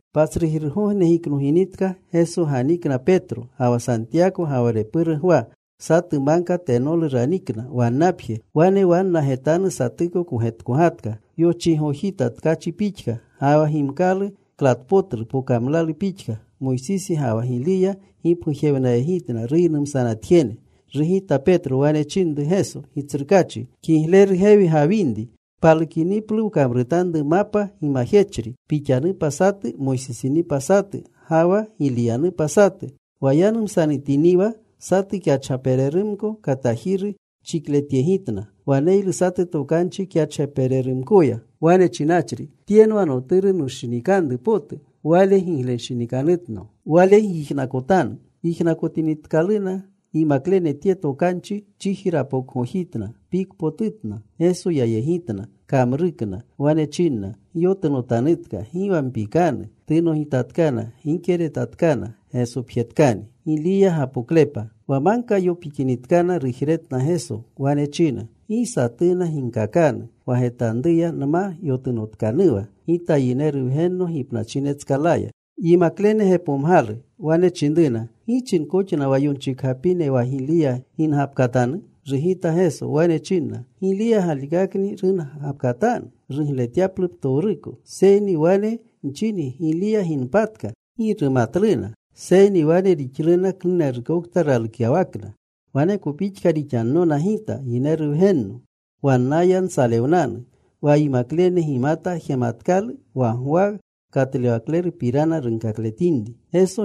Patsrujirgogne giknoginitka, Geso ganikna Petro ga wa Santiyako, ga wa repuru Gwa. Satu magka tenolu ranikna wannapje. Wane wanna getanu satuko kogetkogatka. Yochiigojita tkachi pixka. Ga wa gimkalu klatpotlu pokamlalu pixka. Moysisi ga wa Giliya gipgujewnayegitna ruynumsanatjene. Rugita Petro. Wane chinru Geso, “Gitsrukaachi, kigleru gewi gawinri. Palukiniplu, wkamrutanru mapa gimajechri. Pixanupa satu, Moysisinupa satu, ga wa Giliyanupa satu.” Wa yanumsanatiniwa, satu kyachgapererumko katajiru chikletyegitna. Waneylu satu tokanchi kyachgapererumkoya wane chinachri, “Tyenwa Noturu nushinikanru potu. Wale gigletanshinikanutno. Wale gyijnakotanu.” Yijnakotinitkaluna yimaklene tye tokanchi, chiji rapokgojitna. Pikpotutna. Geso yayegitna. Kamrukna. Wane chinna, “Gyotunotanutka. Gi wa mpikanu.” Tunogitinitkana, gike retatkana. Gesopjetkani. Wa magka yopikinitkana, rujretna Geso. Wane china, “Gi satuna ginkakanu wa getanruya nma yotunotkanuwa Gita Yineru Wgenno gipnachinetskalaya.” Yimaklene gepomgalu. Wane chinruna, “¿Gi chinkoxna wa yonchikgapine wa Giliya gingapkatanu?” Rugita Geso. Wane chinna, “Giliya galikakni rungapkatanu rugletyaplu ptowruko. Seyni wane nchingi, Giliya ginpatka. Gi rumatluna. Seyni wane rixluna klunerukokta ralukyawakna. Waneko pixka rixannona Gita Yineru Wgenno. Wannaya nsalewnanu.” Wa yimaklene gimata jematkalu wa Gwa Katlewaklerupirana runkakletinri.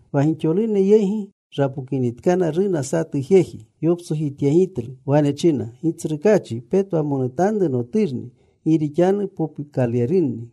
Wa gixolune yegi rapokinitkana, runa satu jeji. Yoptsojityegitlu. Wane china, “Gitsrukaachi, petwamonutanru noturni. Gi rixanu popukalerunni.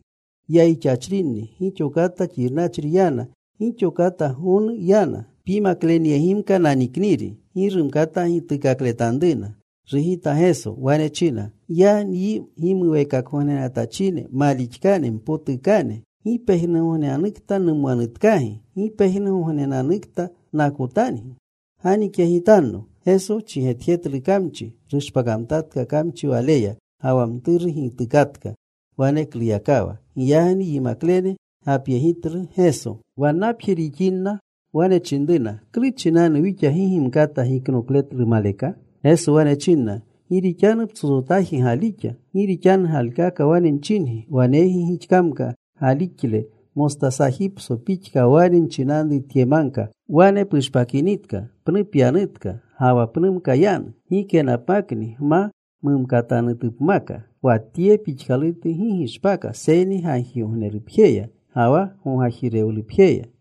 Yayixachrinni. Gixo kata xirnachri yana. Gixo kata gonu yana. Pyimaklenyegimka nanikniri. Gi rumkata gituukakletanruna.” Rugita Geso. Wane china, “¡Ya nyi gimuweekakgognenatachine malixkane, mpotukane! ¿Gi pejnugognenanukta numwanutkagi? ¿Gi pejnugognenanukta nakotangi? Ganikyegitanno.” Geso chigetjetlu kamchi. Rushpakamtatka kamchi waleya. Ga wa mturu gitukatka wanekluyakawa. Giyagni yimaklene gapyegitlu Geso. Wannapje rixinrina, wane chinruna, “¿Klu chinanu wixa gi gimkata giknokletlu maleka?” Geso wane chinna, “Gi rixanu psotsotaji galixa. Gi rixanu galikaka wane nchingi, waneygi gixkamka galixle mostasajipso pixka, wane nchinanru tye magka, ‘Wane pushpakinitka. Pnu pyanutka.’ Ga wa pnumka yanu. Gikenapmakni gma mumkatanutupmaka. Wa tye pixkalutu gi gishpaka seyni gagjigognerupjeya ga wa gogajirewlupjeya.”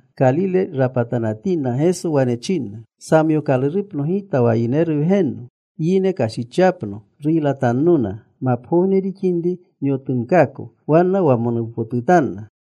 Kalile rapatanatinna, Geso wane chinna, “Samyookalurupno Gita wa Yineru Wgenno, yine kashichyapno. Ruylatannona. Mapgogne rixinri nyotunkaako.” Wanna wamonuwnapotutanna.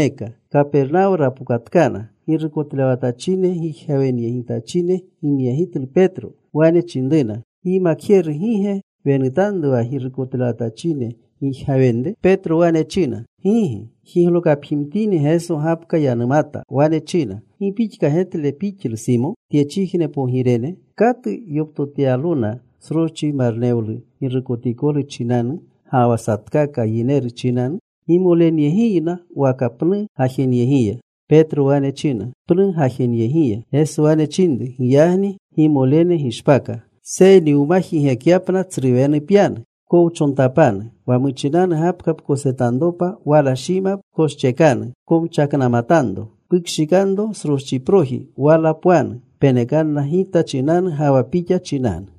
Kapernawo rapokatkana. Girukotlewatachine gijgawenyegitachine ginyegitlu Petro. Wane chinruna, “¿Gyimakjeru gi ge wenutanru wa girukotlewatachine gijgawenre?” Petro wane china, “Gigi.” Jiglokapjimtini, Geso gapka yanumata. Wane china, “¿Gi pixka getle pixlu Simo? Tyechijne pogirene, ¿katu yoptotyalona sroschi marnewlu girukotikolu chinanu, ga wa satkaka yineru chinanu? ¿Gimolenyegiyna waka pnu gajenyegiya?” Petro wane china, “Pnu gajeneyegiya.” Geso wane chinru, “Giyagni gimolene gishpaka. Seyni wma jigekyapna, tsru wenu pyanu. Pkowchontapanu. Wa muchinanu gapka pkosetanropa, wala shima pkoschekanu. Pkomchaknamatanro. Pukshikanro sroschiproji. Wala pwanu. Penekanna Gita chinanu ga wa pixa chinanu.”